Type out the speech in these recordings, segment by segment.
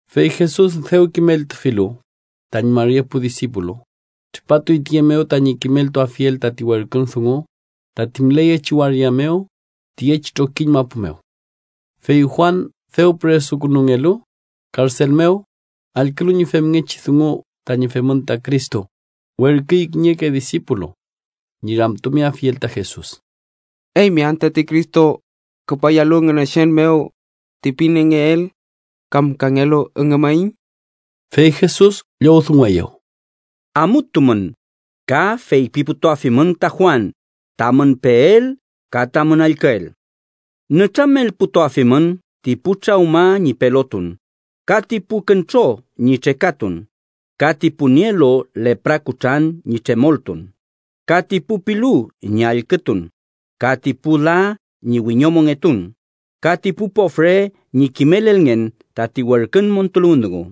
Fey Jesus dew kimeltufilu tañi mari epu disipulu, tripatuy tiye mew tañi kimeltuafiel tati werkün dungu tati müleyechi waria mew tiyechi trokiñ mapu mew. Fey Juan, dew püresuntukungelu karsel mew, allkülu ñi femngechi dungu tañi femün ta Cristo, werküy kiñeke disipulu ñi ramtumeafiel ta Jesus: “¿Eymi am tati Cristo küpayalu Ngünechen mew ti pingeel, kam kangelu üngümaiñ?” Fey Jesus llowdungueyew: “Amutumün ka feypiputuafimün ta Juan tamün peel ka tamün allküel. Nütramelputuafimün ti pu trawma ñi pelotun, ka ti pu küntro ñi trekatun, ka ti pu nielu lepra kutran ñi tremoltun, ka ti pu pilu ñi allkütun, ka ti pu la ñi wiñomongetun ka ti pu pofre ñi kimelelngen tati werkün montuluwün dungu.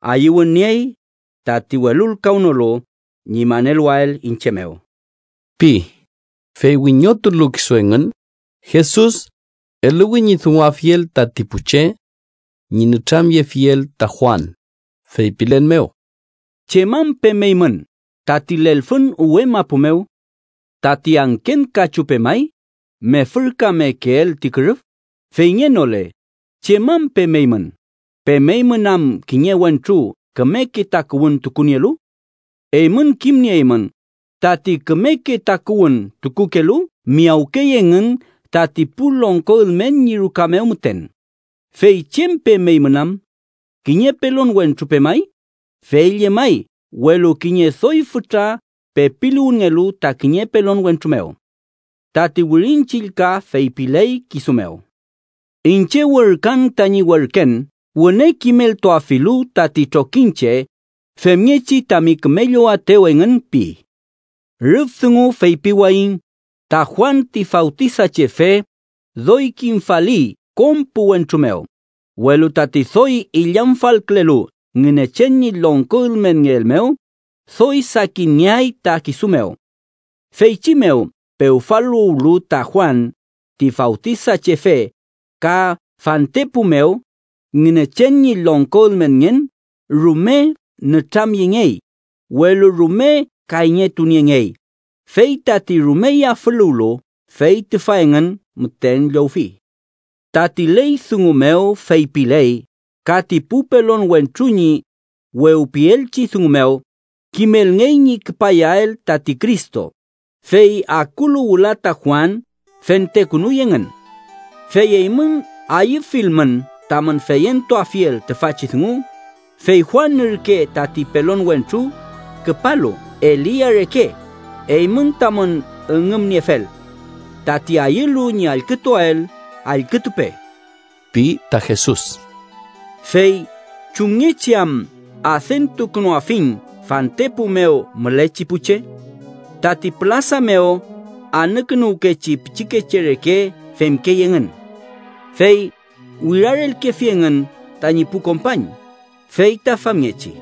¡Ayüwün niey tati welulkawnolu ñi maneluwael iñche mew!” pi. Fey wiñotulu kisu engün, Jesus eluwi ñi dunguafiel tati pu che ñi nütramyefiel ta Juan, feypilen mew: “¿Chem am pemeymün tati lelfün uwe mapu mew? ¿Tati angken kachu pemay mefürkamekeel ti kürüf? Feyngenole, ¿chem am pemeymün? ¿Pemeymün am kiñe wentru kümeke takuwün tukunielu? Eymün kimnieymün tati kümeke takuwün tukuwkelu, miyawkey engün tati pu longko ülmen ñi ruka mew müten. ¿Fey chem pemeymün am? ¿Kiñe pelon wentru pemay? Fey llemay, welu kiñe doy fütra pepiluwünngelu ta kiñe pelon wentru mew. Tati Wirin Chillka feypiley kisu mew: ‘Iñche werküan tañi werken, wüne kimeltuafilu tati trokiñche, femngechi tami küme llowaetew engün’ ―pi. Rüf dungu feypiwayiñ ta Juan ti Fawtisachefe doy kimfali kom pu wentru mew, welu tati doy illamfalkülelu Ngünechen ñi longko ülmenngeel mew, doy sakinngeay ta kisu mew. “Feychi mew pewfaluwlu ta Juan ti Fawtisachefe ka fantepu mew, Ngünechen ñi longko ülmenngen rume nütramyengey, welu rume kayñetuniengey, fey tati rume yafüluwlu, fey tüfa engün müten llowfi. Tati ley dungu mew feypiley ka ti pu pelon wentru ñi wewpielchi dungu mew kimelngey ñi küpayael tati Cristo, fey akulu wüla ta Juan fentekünuy engün. Fey eymün ayüfilmün tamün feyentuafiel tüfachi dungu, fey Juan ürke tati pelon wentru küpalu Elia reke, eymün tamün üngümniefel. Tati ayülu ñi allkütuael, allkütupe ―pi ta Jesus. “Fey, ¿chumngechi am adentukünuafiñ fantepu mew mülechi pu che? Tati pülasa mew anükünuwkechi pichikeche reke femkey engün, fey wirarelkefi engün tañi pu kompañ fey ta famngechi: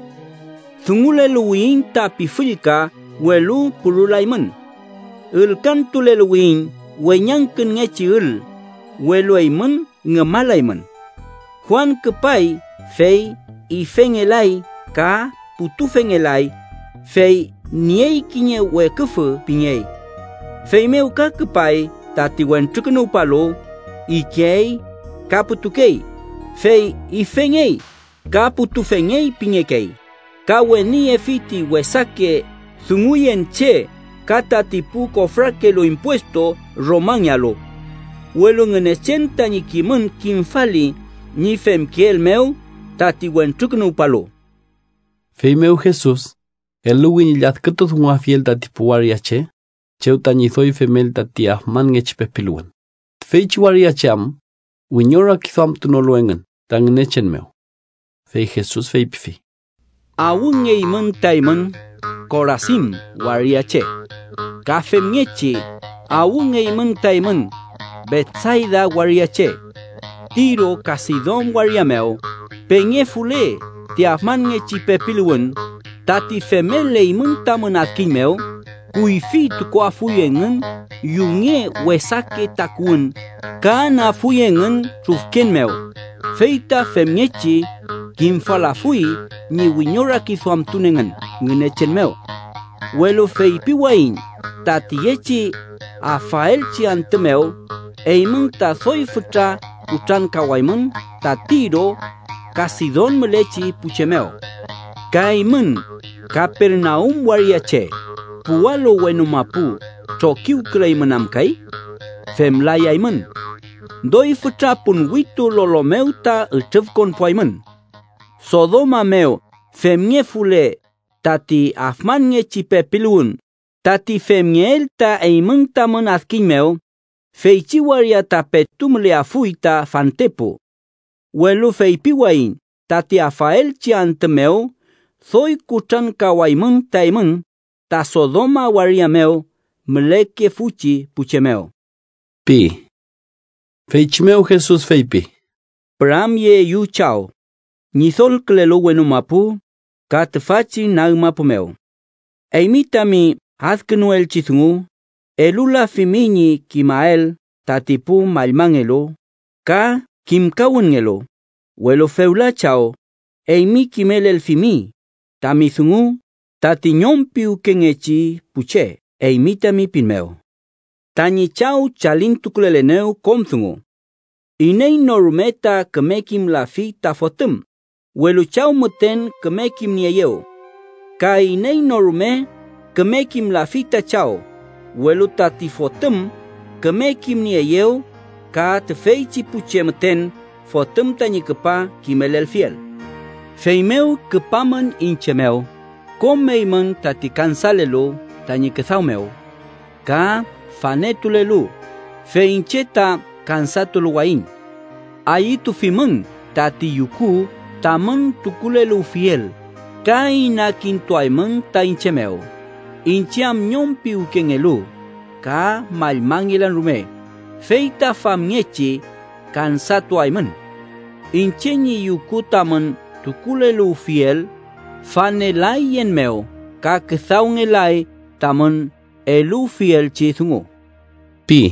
‘Dunguleluwiyiñ ta pifüllka, welu purulaymün. Ülkantuleluwiyiñ weñangkünngechi ül, welu eymün ngümalaymün.’ Juan küpay, fey ifengelay ka putufengelay, fey niey kiñe weküfü pingey. Feymew ka küpay tati Wentrukünuwpalu, ikey ka putukey, fey ifengey ka putufengey pingekey, ka weniyefi ti wesake dunguyen che ka tati pu kofrakelu impuestu Romangealu. Welu Ngünechen tañi kimün kimfali ñi femkeel mew tati Wentrukünuwpalu.” Feymew Jesus eluwi ñi lladkütudunguafiel tati pu waria che chew tañi doy femel tañi afmanngechi pepiluwün, tüfeychi waria che am wiñorakiduamtunolu engün ta Ngünechen mew. Fey Jesus feypifi: “¡Awngeymün ta eymün, Korasin waria che! ¡Ka femngechi awngeymün ta eymün, Betsayda waria che! Tiro ka Sidon waria mew pengefule ti afmanngechi pepiluwün tati femel eymün tamün adkiñ mew, kuyfi tukuafuy engün yunge wesake takuwün ka anüafuy engün trufken mew, fey ta femngechi kimfalafuy ñi wiñorakiduamtun engün Ngünechen mew. Welu feypiwayiñ ta tiyechi afaelchi antü mew eymün ta doy fütra kutrankawaymün ta Tiro ka Sidon mülechi pu che mew. Ka eymün, Kapernaum waria che, ¿puwalu wenu mapu trokiwküleymün am kay? Femlayaymün. ¡Doy fütra ponwitu lolo mew ta ütrüfkonpuaymün! Sodoma mew femngefule tati afmanngechi pepiluwün tati femngeel ta eymün tamün adkiñ mew, feychi waria ta petu müleafuy ta fantepu. Welu feypiwayiñ tati afaelchi antü mew doy kutrankawaymün ta eymün ta Sodoma waria mew mülekefuchi pu che mew” pi. Feychi mew Jesus feypi: “Püramyeeyu Chaw, Ñidolkülelu wenu mapu ka tüfachi nag mapu mew. Eymi tami adkünuelchi dungu elulafimi ñi kimael tati pu mallmangelu ka kimkawünngelu, welu fewla Chaw, eymi kimelelfimi tami dungu tati ñom piwkengechi pu che eymi tami pin mew. “Tañi Chaw chalintukulelenew kom dungu. Iney no rume ta küme kimlafi tati Fotüm, welu Chaw müten küme kimnieeyew. Ka iney no rume küme kimlafi ta Chaw, welu tati Fotüm küme kimnieeyew ka tüfeychi pu che müten Fotüm tañi küpa kimelelfiel. “Feymew küpamün iñche mew kom eymün tati kansalelu tañi küdaw mew ka fanetulelu, fey iñche ta kansatuluwayiñ. Ayütufimün tati yuku tamün tukuleluwfiel, ka inakintuaymün ta iñche mew, iñche am ñom piwkengelu ka mallmangelan rume, fey ta famngechi kansatuaymün. Iñche ñi yuku tamün tukuleluwfiel fanelay yen mew ka küdawngelay tamün eluwfielchi dungu” pi.